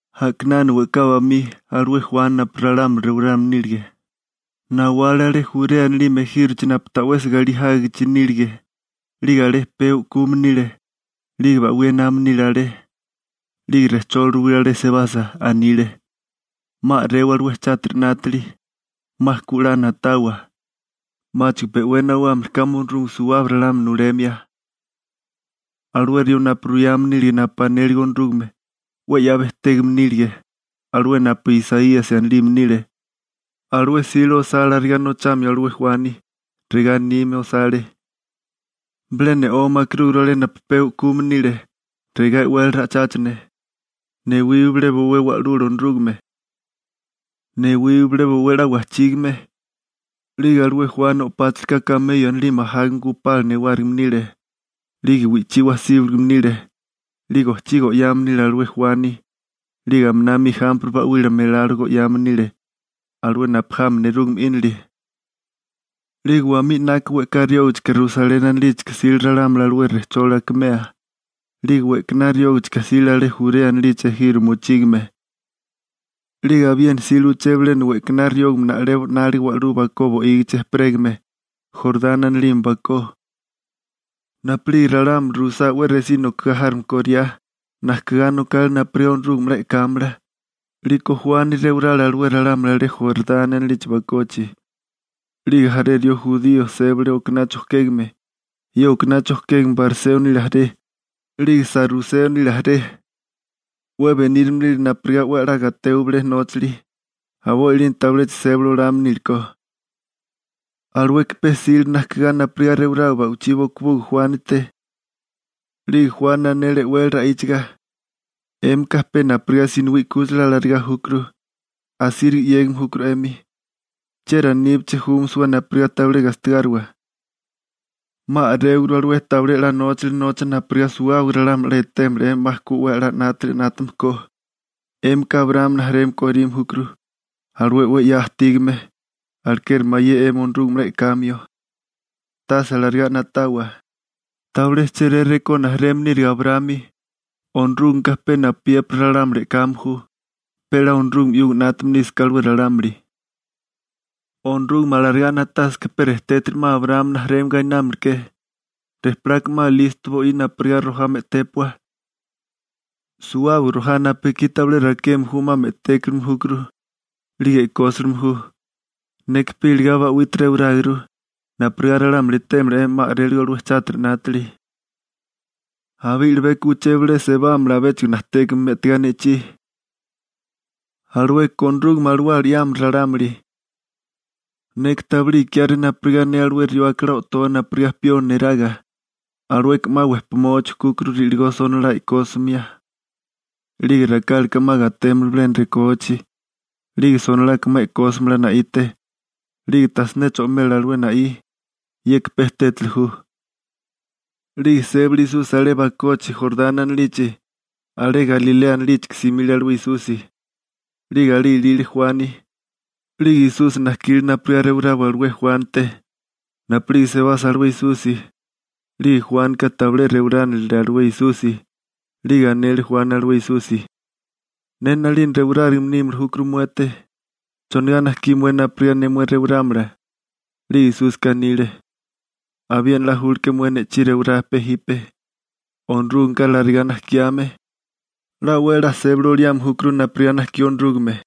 A'kinana we'ká bamí alué Juani napu ralámuli rewarame nílige, nawale alé Jurea anilime ejírochi napu ta'wesi galí jágichi nílige. 'Lige alé pee u'kume nile, 'lige ba'wí ename nile alé. 'Lige rejcholi ruwile alé sebasa. Anile: ―'Ma a'rewa alué chátiri 'nátili. 'Ma ku 'la na'tawa, 'máchigo pe 'we nawámili kame Onorúgame suwábaga ralámuli nulemia. Alué rió napu ruyame nílige napu anélige Onorúgame, 'we 'ya bejtégame nílige, alué napu Isaíasi anilime nile, alué 'sile osá alarigá nochamio alué Juani. Regá anime osale: Bilé ne'ome akerúguru alé napu pee u'kume nile. Regá e'wele ra'icháchane: «Newiwa bilé bowé Wa'lula Onorúgame. Newiwa bilé bowé 'la wajchígame.» 'Lige alué Juani o'páchalaka kameyo anilime ajágame gupala newárigime nile. 'Lige wi'chí wasíbaligame nile. 'Lige ojchí go'yame nile alué Juani, 'lige aminami ijampre ba'wila melalo go'yame nile, alué napu jami nerúgame 'ínili. 'Lige wamí 'naka we'ká riógachika Rusaleni anilíchika jsile ralámuli alué rejcholi akimea, 'lige we'kaná riógichika jsile alé Jurea anilichi ejiro mochígame. 'Lige abiena jsile uché bilena we'kaná riógame na'lebo 'nálige wa'lú bakó bo'ígichi ejperégame, Jorani anilime bakó. Napu'lige ralámuli ruisá 'we resí nokigá járome koriá, najkigá nokale napurigá Onorúgame 'la e'kámala, 'liko Juani rewarale alué ralámuli alé Jorani anilichi bakochi. 'Lige jaré rió jurío sébale okaná chojkégame. Ye okaná chojkégame bariseo nile jaré, 'lige saruseo nile jaré. 'We benírame nile napurigá 'we a'lá gatewa bilé nóchali, a'boi 'lina tabiléchigo sébali olame nílekó. Alueka pe jsile najkigá napurigá rewarawa ba'wichí bokobuga Juánite. 'Lige Juani anele e'wele ra'íchaga: ―¡'Émika pe napurigá sinowí 'kúchila alarigá júkuru, asíriga 'yégame júkuru 'emi! ¿Chieri aníbeché júmasiwa napurigá tabilé gastigáriwa? 'Ma a'réwaguru alué tabilé 'la nóchali nocha napurigá suwábaga ralámuli 'la etémala 'emi 'ma ku 'we a'lá 'nátili 'nátame ko. 'Émika Abraámi rijimala korime júkuru, alué 'we 'ya ajtígame, alekeri mayé 'emi Onorúgame 'la e'kamio. Tase alarigá na'tawa, tabilé chéré rekó rijimala nírige Abraámi. Onorúgameka pe napuyépiri ralámuli e'kame ju, pe 'la Onorúgame 'yuga 'nátame nísaká alué ralámuli. Onorúgame alarigá na'tásaká rejtétiri 'ma Abraámi rijimala gainámaleké. Rejpilaka 'ma listo bo'í napurigá rojá me'tépua. Suwábaga rojá napu ekí tabilé rakeme ju 'ma me'tékime júkuru 'lige e'kósilime ju. Neka pe iligá ba'wite rewaráguru, napurigá ralámuli etémala 'emi 'ma a'réligo alué chátiri 'nátili. Abé i'libeko uché bilé sebámala abéchigo najtékame me'tigá ne'chí. Alueka Onorúgame Alawala 'yámala ralámuli. Neka tabilé ikiáré napurigá ne alué rió akalá o'toa napurigá pioni neraga. Alueka 'ma wejpamoa chujkúkuru ri'ligó sonolá e'kósimia. 'Lige rakálaka 'ma gatémala bilena rekóachi, 'lige sonolaka 'ma e'kósamala na'ite. 'Lige tajsiné cho'mela alué na'í. Yeka pe tétali ju. 'Lige sébale Esusi alé bakochi Jorani anilichi, alé Galilea anilíchika simile alué Esusi. 'Lige alé ilile Juani, 'lige Esusi najkile napurigá rewarawa alué Juánite. Napu'lige sebasa alué Esusi, 'lige Juánika tabilé rewaránilile alué Esusi, 'lige anele Juani alué Esusi: ―Ne 'nalina rewarárigame nímili júkuru muete. ¿Chonigá najkí mué napurigá ne mué rewarámala? 'Lige Esusi anile: ―Abiena 'la julke mué ne'chí rewará. Onorúgameka larigá najkiame, 'la 'we a'lá sébali oliame júkuru napurigá najkí Onorúgame.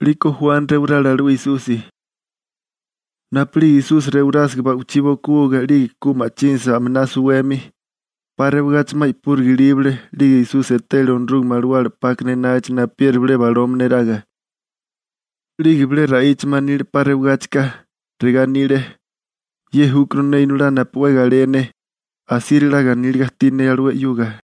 'Liko Juani rewarale alué Esusi. Napu'lige Esusi rewarásiga ba'ichí bokobuga 'lige ku ma'chínasa aminá suwemi, 'pa rewagachi 'ma i'púriga ilíbale 'lige Esusi etele Onorúgame Alawala 'pákana enágichi napuyeri bilé baloma neraga. 'Lige bilé ra'íchame anile 'pa rewigáchika. Regá anile: ―Ye júkuru ne Inolá napu 'we galé ne. Asíriga 'la ganíliga ajtí ne alué 'yuga.